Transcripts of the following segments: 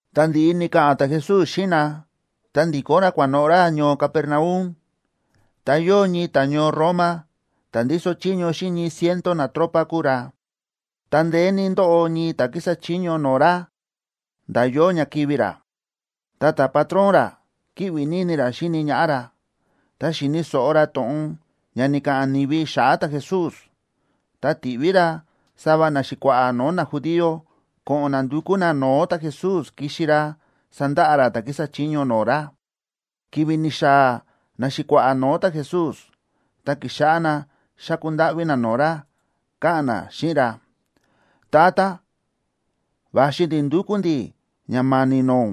Tá ndi̱ꞌi ni̱ka̱ꞌa̱n ta̱Jesús xíꞌin na, ta ndi̱kó ra kua̱noꞌo̱ ra ñoo Capernaum. Ta yóo ñii ta̱ñoo Roma ta̱ ndíso chiño xíꞌin ñii ciento natropa kúu ra, ta ndeé ní ndóꞌo ñii ta̱ kísa chiño no̱o̱ ra nda̱ yóo ña kivi̱ ra. Ta ta̱patrón ra kíꞌvi ní ini ra xíni ñaꞌá ra. Ta xi̱ni̱ so̱ꞌo ra to̱ꞌon ña ni̱ka̱ꞌa̱n ni̱vi xa̱ꞌa̱ ta̱Jesús, ta ti̱ꞌví ra sava naxi̱kua̱ꞌa̱ no̱o̱ najudío ko̱ꞌo̱n na ndukú na no̱o̱ ta̱Jesús kixi ra sandaꞌa ra ta̱ kísa chiño no̱o̱ ra. Ki̱vi̱ ni̱xaa̱ naxi̱kua̱ꞌa̱ no̱o̱ ta̱Jesús, ta ki̱xáꞌá na xáku ndáꞌví na no̱o̱ ra, káꞌa̱n na xíꞌin ra: ―Tata, va̱xi ndi̱ ndúkú ndi̱ ña ma̱ni̱ no̱o̱ ún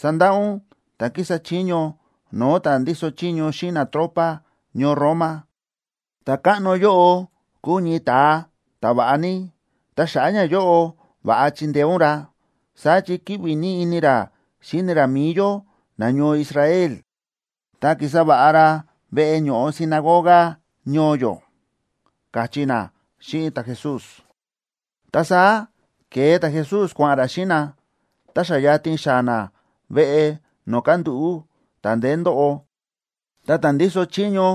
sandaꞌa ún ta̱ kísa chiño no̱o̱ ta̱ ndíso chiño xíꞌin natropa ñoo Roma. Ta̱káꞌno yóꞌo kúu ñii ta̱a ta̱va̱ꞌa ní, ta xa̱ꞌa̱ ñayóꞌo va̱ꞌa chindeé ún ra. Saá chi kíꞌvi ní ini ra xíni ra mi̱i yó nañoo Israel, ta ki̱sa va̱ꞌa ra veꞌe ño̱ꞌo sinagoga ñoo yó ―káchí na xíꞌin ta̱Jesús. Ta saá ke̱e ta̱Jesús kua̱ꞌa̱n ra xíꞌin na. Ta xa yatin xaa̱ na veꞌe no̱o̱ kándúꞌu̱ ta̱ ndeé ndóꞌo, ta ta̱ ndíso chiño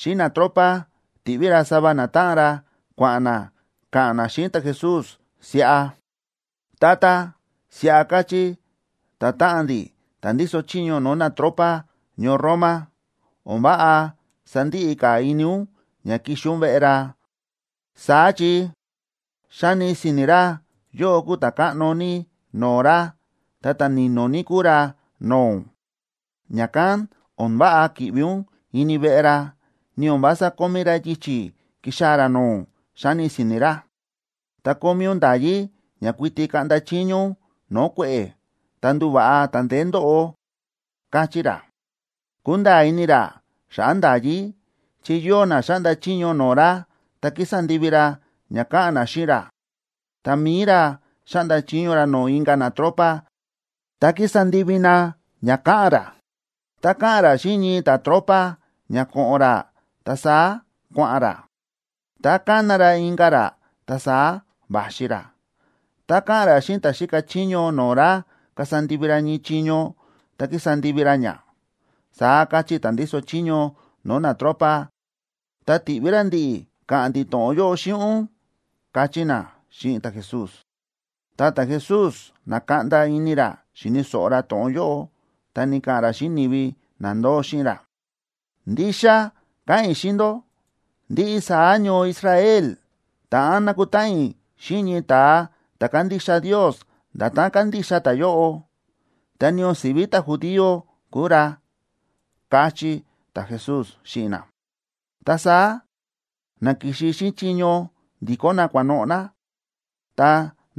xíꞌin natropa ti̱ꞌví ra sava natáꞌan ra kua̱ꞌa̱n na ka̱ꞌa̱n na xíꞌin ta̱Jesús siꞌa: ―Tata, siꞌa káchí ta̱táꞌan ndi̱, ta̱ ndíso chiño no̱o̱ natropa ñoo Roma: O̱n váꞌa sandiꞌi ka̱ ini ún ña kixi ún veꞌe ra. Saá chi xáni si̱ni̱ ra yóꞌó kúu ta̱káꞌno ní no̱o̱ ra, ta ta̱ ni̱no̱ ní kúu ra no̱o̱ ún. Ña̱kán o̱n váꞌa ki̱ꞌvi ún ini veꞌe ra, ni o̱n vása kómí ra yichi̱ kixaa̱ ra no̱o̱ ún, xáni si̱ni̱ ra. Ta kómí ún nda̱yí ña kuiti kaꞌnda chiño ún no̱o̱ kue̱ꞌe̱, ta nduva̱ꞌa ta̱ ndeé ndóꞌo, káchí ra. Kúnda̱a̱ ini ra xa̱ꞌa̱ nda̱yí, chi yóo na xáꞌnda chiño no̱o̱ ra, ta kísa ndivi ra ña káꞌa̱n na xíꞌin ra; ta mi̱i ra xáꞌnda chiño ra no̱o̱ inka̱ natropa, ta kísa ndivi na ña káꞌa̱n ra. Tá káꞌa̱n ra xíꞌin ñii ta̱tropa ña ko̱ꞌo̱n ra, ta saá kua̱ꞌa̱n ra. Tá kána ra inka̱ ra, ta saá va̱xi ra. Tá káꞌa̱n ra xíꞌin ta̱ xíka chiño no̱o̱ ra kasa ndivi ra ñii chiño, ta kísa ndivi ra ña, saá káchí ta̱ ndíso chiño no̱o̱ natropa, ta ti̱ꞌví ra ndi̱ꞌi̱ ka̱ꞌa̱n ndi̱ to̱ꞌon yóꞌo xíꞌin ún ―káchí na xíꞌin ta̱Jesús. Ta ta̱Jesús na̱kaꞌnda ini ra xíni̱ so̱ꞌo ra to̱ꞌon yóꞌo, ta ni̱ka̱ꞌa̱n ra xíꞌin ni̱vi na ndóo xíꞌin ra: ―Ndixa káꞌa̱n i̱ xíꞌin ndó, ndiꞌi saá ñoo Israel ta̱ꞌán nakutáꞌan i̱ xíꞌin ñii ta̱a ta̱ kándixa Ndios nda̱tán kándixa ta̱yóꞌo, ta ni o̱n si̱ví ta̱judío kúu ra ―káchí ta̱Jesús xíꞌin na. Ta saá na ki̱xi xíꞌin chiño ndi̱kó na kua̱noꞌo̱ na. Tá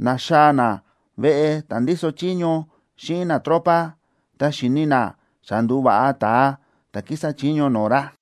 na̱xaa̱ na veꞌe ta̱ ndíso chiño xíꞌin natropa, ta xi̱ni na xa ndu̱va̱ꞌa ta̱a ta̱ kísa chiño no̱o̱ ra.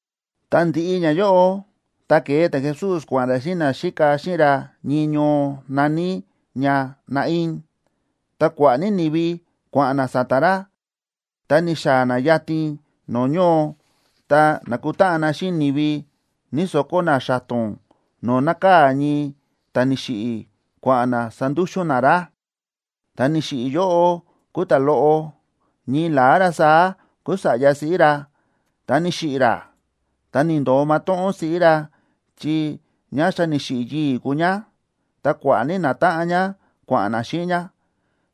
Tá ndi̱ꞌi ñayóꞌo, ta ke̱e ta̱Jesús kua̱ꞌa̱n ra xíꞌin naxíka xíꞌin ra ñii ñoo na̱ní ña Naín. Ta kua̱ꞌa̱ ní ni̱vi kua̱ꞌa̱n na sa̱ta̱ ra. Ta ni̱xaa̱ na yatin no̱o̱ ñoo, ta na̱kutáꞌan na xíꞌin ni̱vi ñíso̱kó na xa̱to̱n no̱o̱ nákaa̱ ñii ta̱ni̱xiꞌi̱ kua̱ꞌa̱n na sandúxu̱n na ra. Ta̱ ni̱xiꞌi̱ yóꞌo kúu ta̱loꞌo, ñii la̱á ra saá kúu sa̱ꞌya siꞌí ra, ta ni̱xiꞌi̱ ra, ta ni̱ndo̱o matóꞌón siꞌí ra, chi ñá xa ni̱xiꞌi̱ yii̱ kúu ñá. Ta kua̱ꞌa̱ ní natáꞌan ñá kua̱ꞌa̱n na xíꞌin ñá.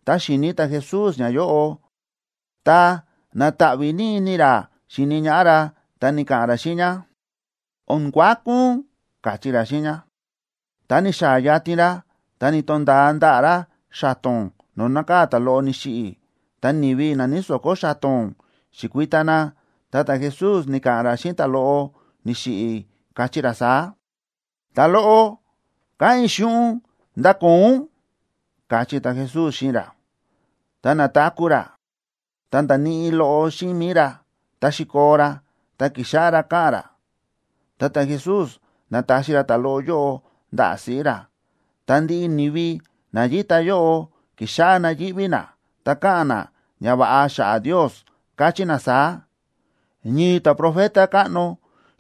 Ta xi̱ni ta̱Jesús ñáyóꞌo, ta na̱taꞌví ní ini ra xíni ñaꞌá ra, ta ni̱ka̱ꞌa̱n ra xíꞌin ñá: ―O̱n kuaku ún ―káchí ra xíꞌin ñá. Ta ni̱xaa̱ yatin ra, ta ni̱to̱nda̱a ndaꞌa̱ ra xa̱to̱n no̱o̱ nákaa̱ ta̱loꞌo ni̱xiꞌi̱. Ta ni̱vi na ñíso̱kó xa̱to̱n, xi̱kui̱ta na, ta ta̱Jesús ni̱ka̱ꞌa̱n ra xíꞌin ta̱loꞌo ni̱xiꞌi̱, káchí ra saá: ―Ta̱loꞌo, káꞌa̱n i̱ xíꞌin ún, ¡ndakoo ún! ―káchí ta̱Jesús xíꞌin ra. Ta na̱taku̱ ra, ta nda̱níꞌi loꞌo xíꞌin mi̱i ra, ta xi̱koo ra, ta ki̱xáꞌá ra káꞌa̱n ra. Ta ta̱Jesús na̱taxi ra ta̱loꞌo yóꞌo ndaꞌa̱ siꞌí ra. Ta ndiꞌi ni̱vi na yíta yóꞌo ki̱xáꞌá na yíꞌví na, ta káꞌa̱n na ñava̱ꞌa xa̱ꞌa̱ Ndios, káchí na saá: ―Ñii ta̱profeta káꞌno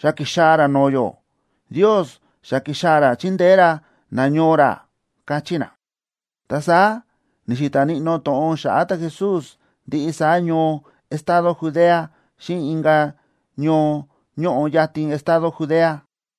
xa ki̱xaa̱ ra no̱o̱ yó. Ndios xa ki̱xaa̱ ra chindeé ra nañoo ra ―káchí na. Ta saá ni̱xi̱ta̱ níꞌnó to̱ꞌon xa̱ꞌa̱ ta̱Jesús ndiꞌi saá ñoo estado Judea, xíꞌin inka̱ ñoo ñóꞌo yatin estado Judea.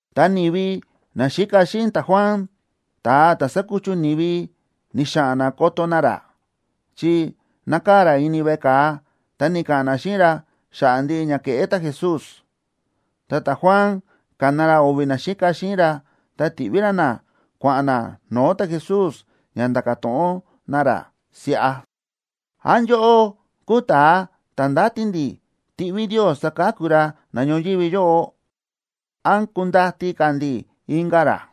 Ta ni̱vi naxíka xíꞌin ta̱Juan ta̱a ta̱ sákuchu ni̱vi, ni̱xa̱ꞌa̱n na koto na ra, chi nákaa̱ ra ini veꞌe ka̱a, ta ni̱ka̱ꞌa̱n na xíꞌin ra xa̱ꞌa̱ ndiꞌi ña kéꞌé ta̱Jesús. Ta ta̱Juan ka̱na ra o̱vi̱ naxíka xíꞌin ra, ta ti̱ꞌví ra na kua̱ꞌa̱n na no̱o̱ ta̱Jesús, ña nda̱ka̱ to̱ꞌon na ra siꞌa: ―¿Án yóꞌó kúu ta̱a ta̱ ndáti ndi̱ tiꞌví Ndios saka̱ku ra na ñoyívi yóꞌo, án kundati ka̱ ndi̱ inka̱ ra?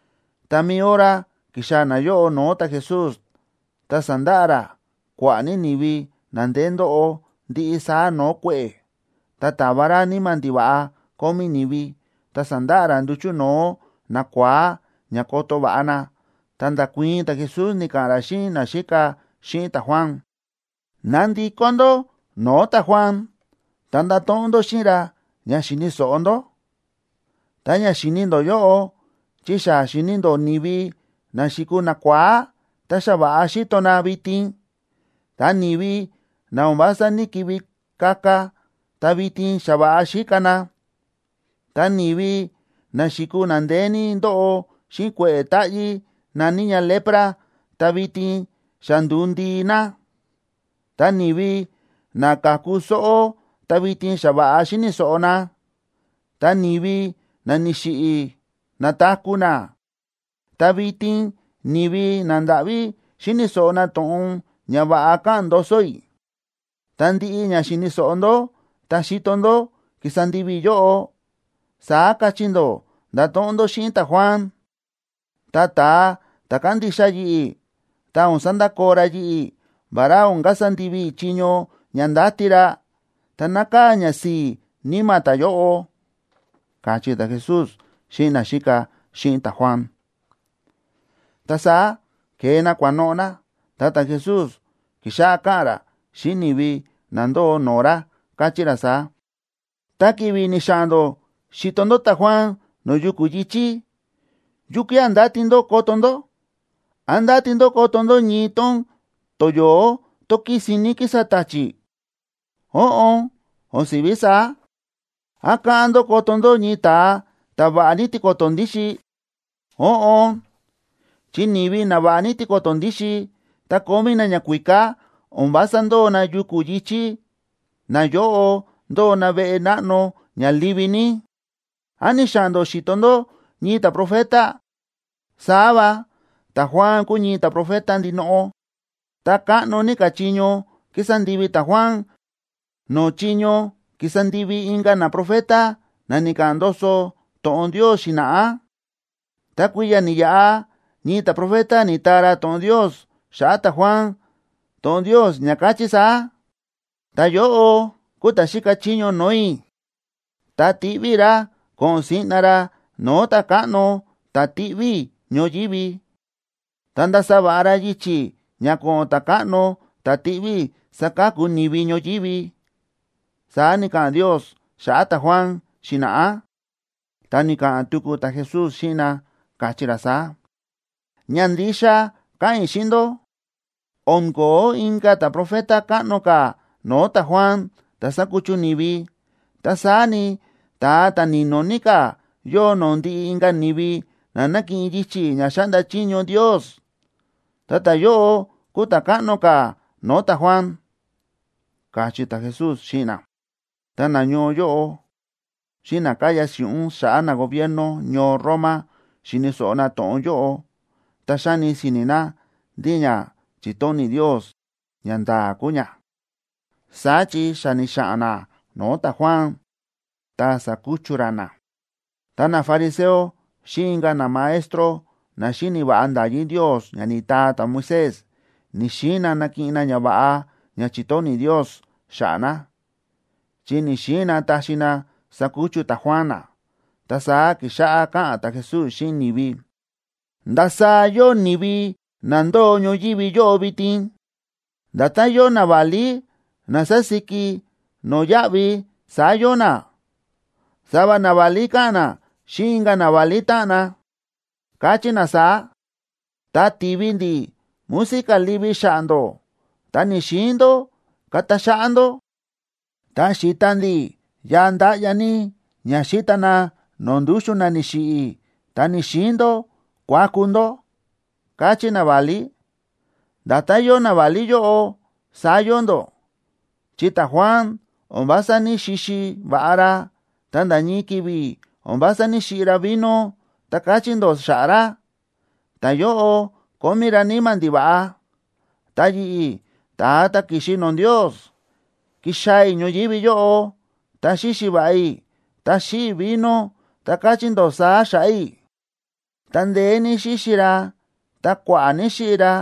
Ta mi̱i hora ki̱xaa̱ nayóꞌo no̱o̱ ta̱Jesús, ta sa̱ndaꞌa ra kua̱ꞌa̱ ní ni̱vi na ndeé ndóꞌo ndiꞌi saá no̱o̱ kue̱ꞌe̱, ta ta̱va ra níma̱ ndiva̱ꞌa kómí ni̱vi, ta sa̱ndaꞌa ra nduchu̱ no̱o̱ nakua̱á ña koto va̱ꞌa na. Ta nda̱kuii̱n ta̱Jesús, ni̱ka̱ꞌa̱n ra xíꞌin naxíka xíꞌin ta̱Juan: ―Ná ndikó ndó no̱o̱ ta̱Juan, ta ndato̱ꞌon ndó xíꞌin ra ña xi̱ni̱ so̱ꞌo ndó, ta ña xi̱ni ndó yóꞌo. Chi xa xi̱ni ndó ni̱vi na xi̱kuu nakua̱á, ta xa va̱ꞌa xíto na vitin. Ta ni̱vi na o̱n vása ní‑kivi kaka, ta vitin xa va̱ꞌa xíka na. Ta ni̱vi na xi̱kuu na ndeé ní ndóꞌo xíꞌin kue̱ꞌe̱ táꞌyí na̱ní ña lepra, ta vitin xa ndu̱u ndii na. Ta ni̱vi na ka̱ku sóꞌó, ta vitin xa va̱ꞌa xíni̱ so̱ꞌo na. Ta ni̱vi na ni̱xiꞌi̱, na̱taku̱ na. Ta vitin ni̱vi nandáꞌví xíni̱ so̱ꞌo na to̱ꞌon ñava̱ꞌa káꞌa̱n ndoso i̱. Ta ndiꞌi ña xi̱ni̱ so̱ꞌo ndó ta xi̱to ndó kísa ndivi i̱ yóꞌo, saá kachí ndó ndato̱ꞌon ndó xíꞌin ta̱Juan. Ta ta̱a ta̱ kándixa yi̱ꞌi̱, tá o̱n sandakoo ra yi̱ꞌi̱, vará o̱n kasa ndivi i̱ chiño ña ndáti ra, ta nákaa̱ ñasi̱i̱ níma̱ ta̱yóꞌo ―káchí ta̱Jesús xíꞌin naxíka xíꞌin ta̱Juan. Ta saá ke̱e na kua̱noꞌo̱ na, ta ta̱Jesús ki̱xáꞌá káꞌa̱n ra xíꞌin ni̱vi na ndóo no̱o̱ ra, káchí ra saá: ―Ta ki̱vi̱ ni̱xa̱ꞌa̱n ndó xi̱to ndó ta̱Juan no̱o̱ yuku̱ yi̱chí, ¿yukía̱ ndáti ndó koto ndó? ¿Án ndáti ndó koto ndó ñii tón toyo̱ó tón kísin ní kísa ta̱chi̱? Óꞌon, o̱n si̱ví saá. ¿Án káꞌán ndó koto ndó ñii ta̱a ta̱ va̱ꞌa ní tiko̱to̱ ndíxin? Óꞌon, chi ni̱vi na va̱ꞌa ní tiko̱to̱ ndíxin ta kómí na ñakuíká, o̱n vása ndóo na yuku̱ yi̱chí, nayóꞌo ndóo na veꞌe náꞌno ña livi ní. ¿Án ni̱xa̱ꞌa̱n ndó xi̱to ndó ñii ta̱profeta? Saá va, ta̱Juan kúu ñii ta̱profeta ndinoꞌo, ta káꞌno ní ka̱ chiño ki̱sa ndivi ta̱Juan no̱o̱ chiño ki̱sa ndivi inka̱ naprofeta na ni̱ka̱ꞌa̱n ndoso to̱ꞌon Ndios xi̱na̱ꞌá. Ta kui̱ya̱ ni̱yaꞌa ñii ta̱profeta ni̱taa ra to̱ꞌon Ndios xa̱ꞌa̱ ta̱Juan, to̱ꞌon Ndios ña káchí saá: Ta̱yóꞌo kuu ta̱ xíka chiño no̱o̱ i̱, ta tiꞌví i̱ ra ko̱ꞌo̱n siꞌna ra no̱o̱ Ta̱káꞌno ta̱ tiꞌví i̱ ñoyívi. Ta ndasa va̱ꞌa ra yichi̱ ña ko̱ꞌo̱n Ta̱káꞌno ta̱ tiꞌví i̱ saka̱ku ni̱vi ñoyívi, saá ni̱ka̱ꞌa̱n Ndios xa̱ꞌa̱ ta̱Juan xi̱na̱ꞌá. Ta ni̱ka̱ꞌa̱n tuku ta̱Jesús xíꞌin na, káchí ra saá: ―Ña ndixa káꞌa̱n i̱ xíꞌin ndó, o̱n ko̱ó inka̱ ta̱profeta káꞌno ka̱ no̱o̱ ta̱Juan, ta̱ sa̱kuchu ni̱vi. Ta saá ni, ta̱a ta̱ ni̱no̱ ní ka̱ yóo no̱o̱ ndiꞌi inka̱ ni̱vi na nákiꞌin yichi̱ ña xáꞌnda chiño Ndios, ta ta̱yóꞌo kúu ta̱ káꞌno ka̱ no̱o̱ ta̱Juan ―káchí ta̱Jesús xíꞌin na. Ta nañoo yóꞌo xíꞌin na káya si̱ꞌún xa̱ꞌa̱ nagobierno ñoo Roma xi̱ni̱ so̱ꞌo na to̱ꞌon yóꞌo, ta xáni si̱ni̱ na ndí ña chi̱tóni̱ Ndios ñanda̱a̱ kúu ña. Saá chi xa ni̱xa̱ꞌa̱n na no̱o̱ ta̱Juan ta sa̱kuchu ra na. Ta nafariseo xíꞌin inka̱ namaestro na xíni̱ va̱ꞌa nda̱yí Ndios ña ni̱taa ta̱Moisés, ni̱‑xiin na nakiꞌin na ñava̱ꞌa ña chi̱tóni̱ Ndios xa̱ꞌa̱ na, chi ni̱‑xiin na taxi na sakuchu ta̱Juan na. Ta saá ki̱xáꞌá káꞌa̱n ta̱Jesús xíꞌin ni̱vi: ―¿Ndasaá yóo ni̱vi na ndóo ñoyívi yóꞌo vitin? Nda̱tán yóo naválí na sásíki no̱yáꞌvi, saá yóo na. Sava naválí káꞌa̱n na xíꞌin inka̱ naválí táꞌan na, káchí na saá: “Tá ti̱vi ndi̱ música livi xa̱ꞌa̱ ndó, ta ni̱‑xiin ndó kata xáꞌá ndó. Tá xi̱ta ndi̱ yaa ndáꞌya ní ña xíta na no̱o̱ ndúxu̱n na ni̱xiꞌi̱, ta ni̱‑xiin ndó kuaku ndó”, káchí naválí. Nda̱tán yóo naválí yóꞌo, saá yóo ndó, chi ta̱Juan o̱n vása ní‑xixi va̱ꞌa ra, ta nda̱ ñii ki̱vi̱ o̱n vása ní‑xiꞌi ra vino, ta káchí ndó xa̱ꞌa̱ ra: “Ta̱yóꞌo kómí ra níma̱ ndiva̱ꞌa.” Ta yi̱ꞌi̱, ta̱a ta̱ ki̱xi no̱o̱ Ndios, ki̱xaa̱ i̱ ñoyívi yóꞌo, ta xíxi va̱ꞌa i̱, ta xíꞌi i̱ vino, ta káchí ndó saá xa̱ꞌa̱ i̱: “Ta ndeé ní xíxi ra, ta kua̱ꞌa̱ ní xíꞌi ra.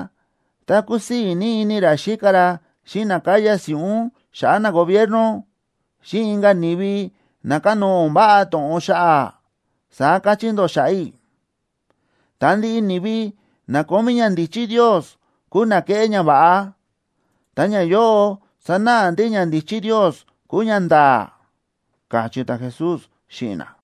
Ta kúsii̱ ní ini ra xíka ra xíꞌin na káya si̱ꞌún xa̱ꞌa̱ nagobierno, xíꞌin inka̱ ni̱vi na kánóo o̱n váꞌa to̱ꞌon xa̱ꞌa̱”, saá káchí ndó xa̱ꞌa̱ i̱. Ta ndiꞌi ni̱vi na kómí ñandíchí Ndios, kúu na kéꞌé ñava̱ꞌa, ta ñayóꞌo sánáꞌa ndí ñandíchí Ndios kúu ñanda̱a̱ ―káchí ta̱Jesús xíꞌin na.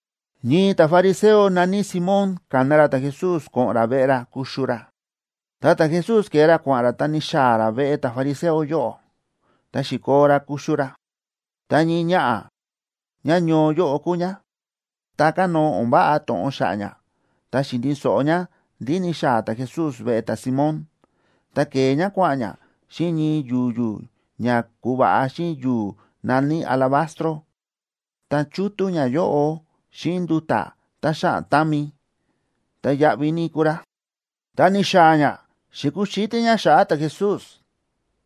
Ñii ta̱fariseo na̱ní Simón ka̱na ra ta̱Jesús ko̱ꞌo̱n ra veꞌe ra kuxu ra. Ta ta̱Jesús ke̱e ra kua̱ꞌa̱n ra, ta ni̱xaa̱ ra veꞌe ta̱fariseo yóꞌo, ta xi̱koo ra kuxu ra. Ta ñii ñaꞌa̱, ñáñoo yóꞌo kúu ñá, ta kánóo o̱n váꞌa to̱ꞌon xa̱ꞌa̱ ñá, ta xi̱ni̱ so̱ꞌo ñá ndí ni̱xaa̱ ta̱Jesús veꞌe ta̱Simón. Ta ke̱e ñá kua̱ꞌa̱n ñá xíꞌin ñii yu̱yu̱ ña ku̱va̱ꞌa xíꞌin yu̱u̱ na̱ní alabastro, ta chútú ñayóꞌo xíꞌin nduta̱ tá xáꞌan támi, tá yáꞌví ní kúu rá. Ta ni̱xaa̱ ñá, xi̱kuxítí ñá xa̱ꞌa̱ ta̱Jesús,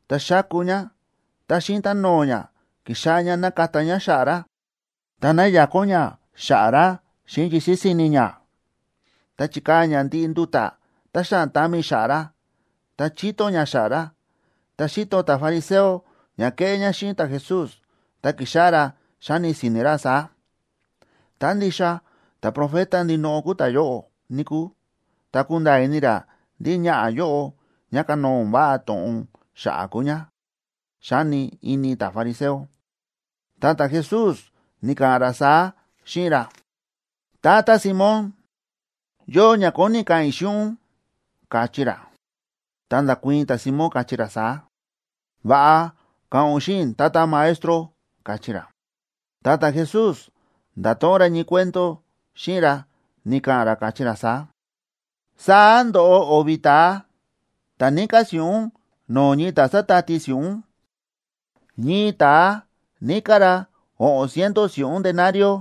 ta xáku ñá, ta xíꞌin táno̱o̱ ñá, ki̱xáꞌá ñá nákata ñá xa̱ꞌa̱ ra, ta náyakón ñá xa̱ꞌa̱ ra xíꞌin yisi̱ si̱ni̱ ñá. Ta chi̱kaa̱ ñá ndiꞌi nduta̱ tá xáꞌan támi xa̱ꞌa̱ ra, ta chíto ñá xa̱ꞌa̱ ra. Ta xi̱to ta̱fariseo ña kéꞌé ñá xíꞌin ta̱Jesús, ta ki̱xáꞌá ra xáni si̱ni̱ ra saá: “Tá ndixa ta̱profeta ndinoꞌo kúu ta̱yóꞌo, níkúu, ta kunda̱a̱ ini ra ndí ñaꞌa̱ yóꞌo ñá kánóo o̱n váꞌa to̱ꞌon xa̱ꞌa̱ kúu ñá”, xáni ini ta̱fariseo. Ta ta̱Jesús ni̱ka̱ꞌa̱n ra saá xíꞌin ra: ―Tata Simón, yóo ña kóni i̱ ka̱ꞌa̱n i̱ xíꞌin ún ―káchí ra. Ta nda̱kuii̱n ta̱Simón, káchí ra saá: ―Va̱ꞌa, ka̱ꞌa̱n ún xíꞌin i̱, Tata Maestro ―káchí ra. Ta ta̱Jesús nda̱to̱ꞌon ra ñii cuento xíꞌin ra, ni̱ka̱ꞌa̱n ra káchí ra saá: ―Saá ndo̱ꞌo o̱vi̱ ta̱a ta̱ níká si̱ꞌún no̱o̱ ñii ta̱ sa̱tati si̱ꞌún. Ñii ta̱a níká ra o̱ꞌo̱n ciento si̱ꞌún denario,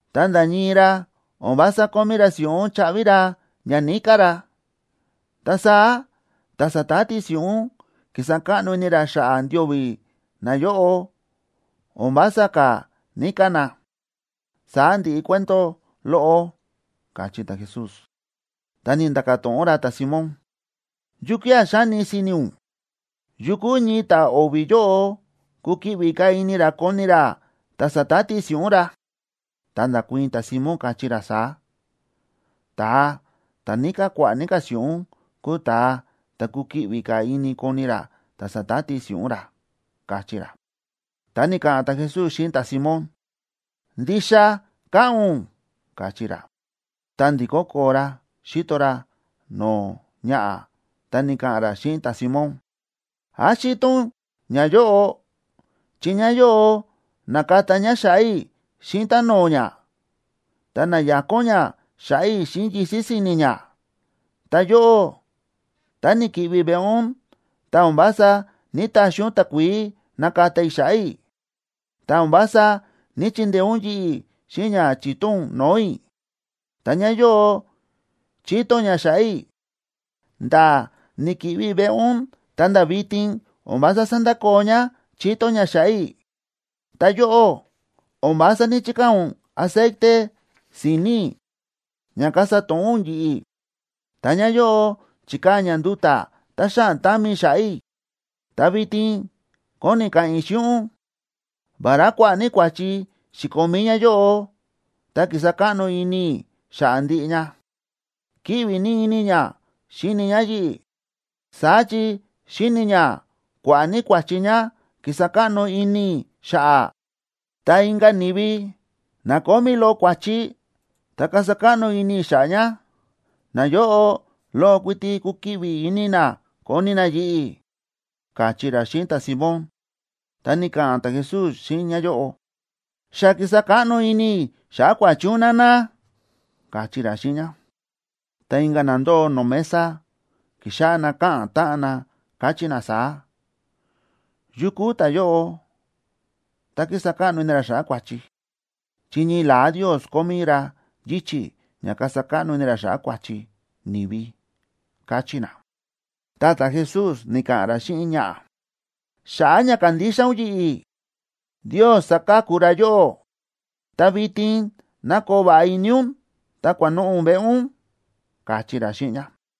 Ta nda̱ ñii ra o̱n vása kómí ra si̱ꞌún chaꞌvi ra ña níká ra. Ta saá ta̱ sa̱tati si̱ꞌún ki̱sa káꞌno ini ra xa̱ꞌa̱ ndio̱vi̱ nayóꞌo, o̱n vása ka̱ níká na. Saá ndi̱ꞌi cuento loꞌo ―káchí ta̱Jesús. Ta ni̱nda̱ka̱ to̱ꞌon ra ta̱Simón: ―¿Yukía̱ xáni si̱ni̱ ún? ¿Yukú ñii ta̱ o̱vi̱ yóꞌo kukiꞌvi ka̱ ini ra koni ra ta̱ sa̱tati si̱ꞌún ra? Ta nda̱kuii̱n ta̱Simón, káchí ra saá: ―Ta̱a ta̱ níká kua̱ꞌa̱ ní ka̱ si̱ꞌún kúu ta̱a ta̱ kukiꞌvi ka̱ ini koni ra ta̱ sa̱tati si̱ꞌún ra ―káchí ra. Ta ni̱ka̱ꞌa̱n ta̱Jesús xíꞌin ta̱Simón: ―Ndixa káꞌa̱n ún ―káchí ra. Ta ndi̱kó koo ra xíto ra no̱o̱ ñaꞌa̱, ta ni̱ka̱ꞌa̱n ra xíꞌin ta̱Simón: ―¿Án xíto ún ñáyóꞌo? Chi ñáyóꞌo na̱kata ñá xa̱ꞌa̱ i̱ xíꞌin táno̱o̱ ñá, ta na̱yakón ñá xa̱ꞌa̱ i̱ xíꞌin yisi̱ si̱ni̱ ñá. Ta yóꞌó, tá ni̱ki̱ꞌvi i̱ veꞌe ún, ta o̱n vása ní‑taxi ún takuií nakata i̱ xa̱ꞌa̱ i̱, ta o̱n vása ní‑chindeé ún yi̱ꞌi̱ xíꞌin ña chíto ún no̱o̱ i̱. Ta ñáyóꞌo chíto ñá xa̱ꞌa̱ i̱, nda̱ ni̱ki̱ꞌvi i̱ veꞌe ún ta̱nda̱ vitin o̱n vása sándakoo ñá chíto ñá xa̱ꞌa̱ i̱. Ta yóꞌó, o̱n vása ní‑chikaa̱ ún aceite si̱ni̱ i̱ ña kasa to̱ꞌó ún yi̱ꞌi̱. Ta ñáyóꞌo chi̱kaa̱ ñá nduta̱ tá xáꞌan támi xa̱ꞌa̱ i̱. Ta vitin kóni i̱ ka̱ꞌa̱n i̱ xíꞌin ún: Vará kua̱ꞌa̱ ní kua̱chi xi̱komí ñáyóꞌo, ta ki̱sa káꞌno ini i̱ xa̱ꞌa̱ ndiꞌi ña. Kíꞌvi ní ini ñá xíni ñá yi̱ꞌi̱, saá chi xíni̱ ñá kua̱ꞌa̱ ní kua̱chi ñá ki̱sa káꞌno ini i̱ xa̱ꞌa̱. Ta inka̱ ni̱vi, na kómí loꞌo kua̱chi, ta kasa káꞌno ini i̱ xa̱ꞌa̱ ña, nayóꞌo loꞌo kuiti kukiꞌvi ini na koni na yi̱ꞌi̱ ―káchí ra xíꞌin ta̱Simón. Ta ni̱ka̱ꞌa̱n ta̱Jesús xíꞌin ñáyóꞌo: ―Xa ki̱sa káꞌno ini i̱ xa̱ꞌa̱ kua̱chi ún, nana ―káchí ra xíꞌin ñá. Ta inka̱ na ndóo no̱o̱ mesa, ki̱xáꞌá na káꞌa̱n táꞌan na, káchí na saá: ―¿Yu kúu ta̱yóꞌo, ta kísa káꞌno ini ra xa̱ꞌa̱ kua̱chi? Chi ñii la̱á Ndios kómí ra yichi̱ ña kasa káꞌno ini ra xa̱ꞌa̱ kua̱chi ni̱vi ―káchí na. Ta ta̱Jesús ni̱ka̱ꞌa̱n ra xíꞌin ñaꞌa̱: ―Xa̱ꞌa̱ ña kándixa ún yi̱ꞌi̱, Ndios sa̱ka̱ku ra yóꞌó. Ta vitin ná koo va̱ꞌa ini ún ta kua̱noꞌo̱ ún veꞌe ún ―káchí ra xíꞌin ñá.